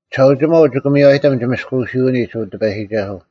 ᒋᓴᐅᒋᒪᐤ ᒋᑭ ᒥᔽᔨᑎᒻ ᒋᒥᔅᑯᐅᓯᐅᓂᒡ, ᐅ ᑎᐸᔨᒋᒐᓱᐤ: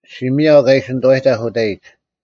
ᔅᒋ ᒥᔭᐤ ᑲ ᐃᓯ ᓂᑐᐛᔨᑕᐧᒃ ᐅᑕᐃᒡ,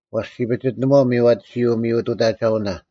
ᐛᔅ ᔅᒋ ᐱᔅᑎᓇᒧᐛᐤ ᒥᔽᑎᓱᐎ ᒥᔪᑐᑕᒐᐅᓇ: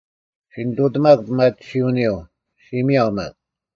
ᔅᒋ ᓂᑐᑎᒪᒄ ᐱᒪᑎᓯᐅᓂᔪᐤ, ᔅᒋ ᒥᔭᐤ ᒪᒃ,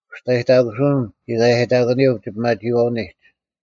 ᐅᒋᔅᑕᔨᑕᑯᓱᐅᓐ ᒋᐧᑲᔭᔨᑕᑯᓂᔪᐤ ᒋᐱᒪᒋᐃᐛᐅᓂᒡ: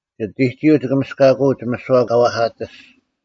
ᒋᑎᒋᔪᐤ ᒋᑭ ᒥᔅᑲᑯᐅᒡ ᒥᓯᐛ ᑲ ᐛᐧᑲᑎᔅᒡ,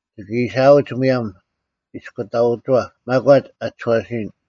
ᒋᑭ ᐃᓯᐊᐅᒡ ᒧᔭᒻ ᐃᔅᑯᑕᐅᒋᐛᑉ ᒪᒂᒡ ᐊ ᒋᔄᓯᔨᓐ: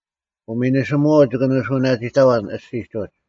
ᐅᒥᓂᓯᒧᐛᐤ ᒋᑭ ᓂᓱᐅᓇᒋᑕᐛᓐ ᐊᔅᒋᒡ ᐅᒡ,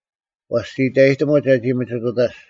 ᐛᔅ ᒋ ᐃᑕᔨᑎᒧᒡ ᒐᒋ ᒥᒋᑐᑕᔅᒡ: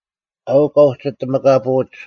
ᐊᐅᒄ ᑲ ᐅᒋ ᐊᑎᒥᑲᐳᐅᒡ,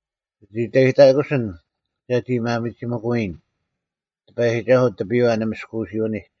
ᒋᑦ ᐃᑕᔨᑕᑯᓯᓐ ᒐᒋ ᒪᒥᒋᒥᑯᐎᔨᓐ, ᑎᐸᔨᒋᒐᓱᐤ, ᑎᐱᔽ ᒋᒥᔅᑯᐅᓯᐅᓂᒡ: